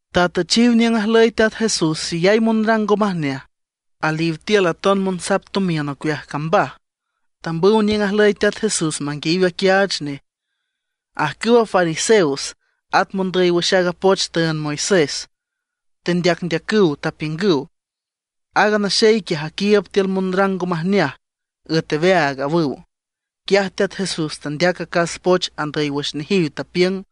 Tatüchiw niüng ajlüy Teat Jesús xeyay monrang ngo majneaj; aliw tiül aton monsap tomiün ocueaj cambaj. Tambüw niüng ajlüy Teat Jesús manguiayiw aquiaach nej. Ajcüwa fariseos, at mondüy wüx aaga poch tüünd Moisés tendeacndeacüw, tapiüngüw: ―Aaga naxey quiaj aquiiüb tiül monrang ngo majneaj, üet aweaag ―awüw. Quiaj Teat Jesús tandeac acas poch andüy wüx nejiw, tapiüng: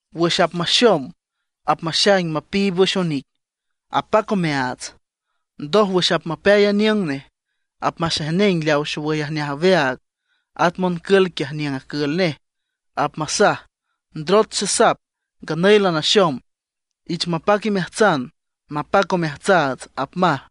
Wüx apmaxom apmaxaing mapiib wüx onic, apac omeaats. Ndoj, wüx apmapeay aniüng nej apmaxejneng leaw xowüy ajneaj aweaag, at moncǘlan quiaj niüng acül nej, apmasaj: “Ndrot xesap, nganüy lanaxom. Ich mapac imeajtsan, mapac omeajtsaats”, apmaj.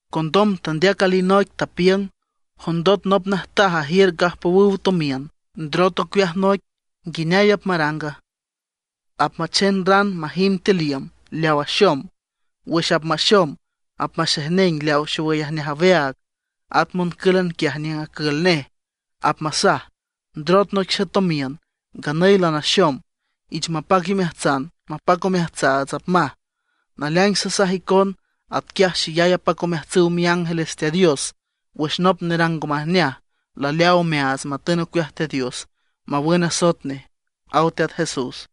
Condom tandeac alinoic, tapiüng: ―Jondot nop najtaj ajiür gajpowüw tomiün, ndrot ocueaj noic, ¿nguineay apmaranga? Apmachen ran majimb tiül iüm leaw axom. Wüx apmaxom apmaxejneng leaw xowüy ajneaj aweaag, at moncǘlan quiaj niüng acül nej, apmasaj: “Ndrot noic xetomiün, nganüy lanaxom. Ich mapac imeajtsan, mapac omeajtsaats”, apmaj. Naleaing sasaj icon, atquiaj xeyay apac omeajtsüw miángeles Teat Dios wüx nop nerang ngo majneaj laleaaw omeaats matün ocueaj Teat Dios mawün asoet nej ―aw Teat Jesús.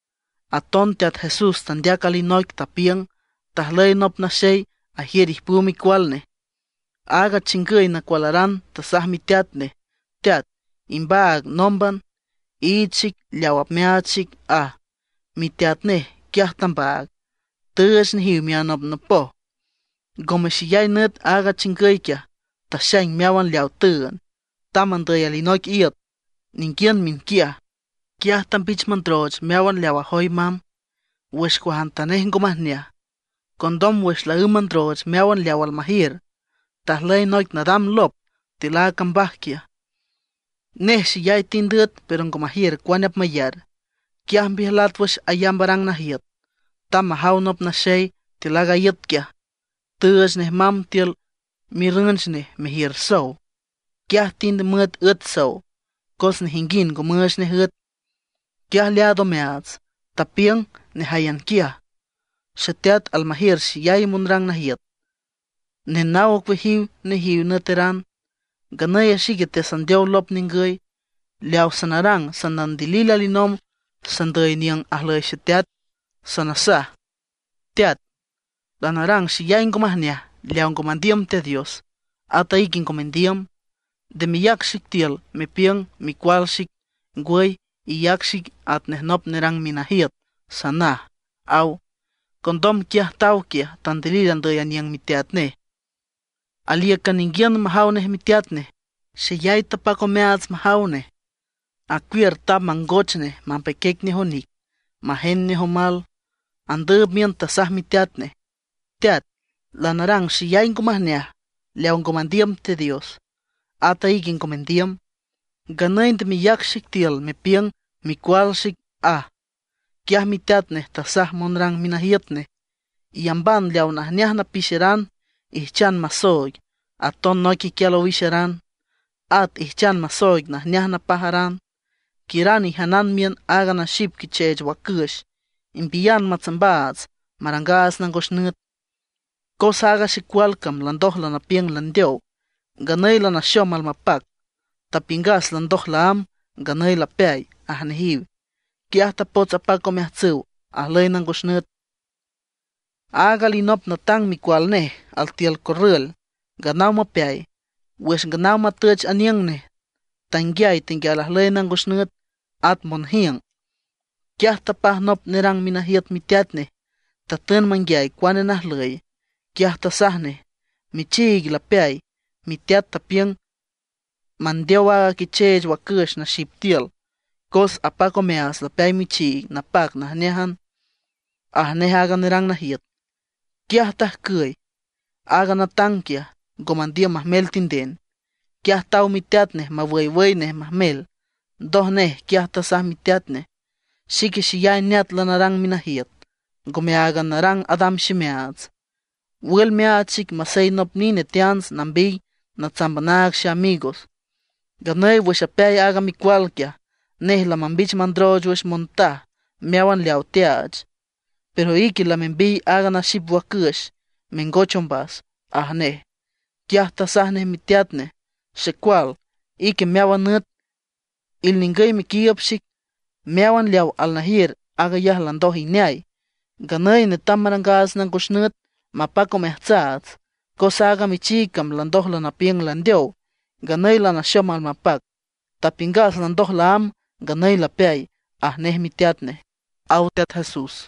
Aton Teat Jesús tandeac alinoic, tapiüng: ―Tajlüy nop naxey ajiür ijpüw micual nej. Aaga chingüy nacualaran tasaj miteat nej: “Teat, imbaag nómban, iich xic leaw apmeaach xic”, aj. Miteat nej quiaj tambaag, tüüch nejiw mianopnopoj. Ngome xeyay nüt aaga chingüy quiaj taxaing meáwan leawa tüünd. Tamb andüy alinoic iüt ninguiün miünquiaj. Quiaj tambich mandrooch meáwan leaw ajoy mamb wüx cuajantanej ngo majneaj. Condom wüx laǘmb mandrooch meáwan leaw almajiür, tajlüy noic nadam lop tiül aaga cambaj quiaj; nej xeyay tind üet pero ngo majiür cuane apmayar. Quiaj mbiüjlat wüx ayamb arang najiüt. Tamb majaw nop naxey tiül aaga iüt quiaj; tüüch nej mamb tiül mirrünch nej mejiür sow. Quiaj tind müet üet sow, cos nejinguind ngo müüch nej üet. Quiaj leaad omeaats, tapiüng nejáyan quiaj: “¡Xeteat almajiür xeyay monrang najiüt, nenaw ocueajiw nejiw nüeteran; nganüy a xique teasandeow lop ningüy! Leaw sanarang, sanandilil alinomb sandüy niüng ajlüy xeteat. Sanasaj: Teat, lanarang xeyay ngo majneaj leaw ngo mandiüm Teat Dios, at ique ngo mendiüm. Nde meyac xic tiül mepiüng micual xic. Ngwüy, iyac xic atnej nop nerang minajiüt, sanaj”, aw. Condom quiaj taw quiaj, tandilil andüy aniüng miteat nej. ’Alíücan ninguiün majaw nej miteat nej, xeyay tapac omeaats majaw nej. Acuiür tamb mangoch nej mapeiquiec nej onic, majend nej omal. Andüüb miün tasaj miteat nej: “Teat, lanarang xeyay ngo majneaj leaw ngo mandiüm Teat Dios, ata ique ngo mendiüm. Nganüy nde meyac xic tiül mepiüng micual xic”, aj. Quiaj miteat nej tasaj monrang minajiüt nej: “Iyamban leaw najneaj napixeran ijchan masooig, aton noic iquial owixeran, at ijchan masooig najneaj napajaran. ¡Quiüran ijanan miün aaga naxip quicheech wacüx; imbiyan matsambaats marangaats nangos nüt! Cos aaga xecual cam landoj lanapiüng landeow, nganüy lanaxom almapac. Tapiüngas landoj laámb, nganüy lapeay”, aj nejiw. Quiaj tapots apac omeajtsüw ajlüy nangos nüt. ’Aaga alinop natang micual nej altiül corrül nganaw mapeay. Wüx nganaw matüch aniüng nej, tanguiay tenguial ajlüy nangos nüt, at monjiüng. Quiaj tapaj nop nerang minajiüt miteat nej, tatün manguiay cuane najlüy. Quiaj tasaj nej: “Michiig lapeay, miteat tapiüng mandeow aaga quicheech wacüx naxip tiül, cos apac omeaats lapeay michiig napac najneájan”, aj nej aaga nerang najiüt. Quiaj tajcüy aaga natang quiaj, ngo mandiüm majmel tinden. Quiaj taw miteat nej mawüywüy nej majmel. Ndoj nej quiaj tasaj miteat nej: “Xique xeyay neat lanarang minajiüt, ngome áag narang adam ximeaats. Wül meaach xic masey nop nine teants nambiy natsamb anaag xeamigos. Nganüy wüx apeay aaga micual quiaj, nej lamambich mandrooch wüx montaj meáwan leawa teaach; pero ique lamembiy aaga naxip wacüx mengoch ombas”, aj nej. Quiaj tasaj nej miteat nej: “Xecual, ique meáwan nüt ilningüy mequiiüb xic. Meáwan leawa alnajiür, aag ayaj landoj ineay. Nganüy netam marangaats nangos nüt mapac omeajtsaats, cos aaga michiig cam landoj lanapiüng landeow, nganüy lanaxom almapac. Tapiüngas landoj laámb, nganüy lapeay”, aj nej miteat nej ―aw Teat Jesús.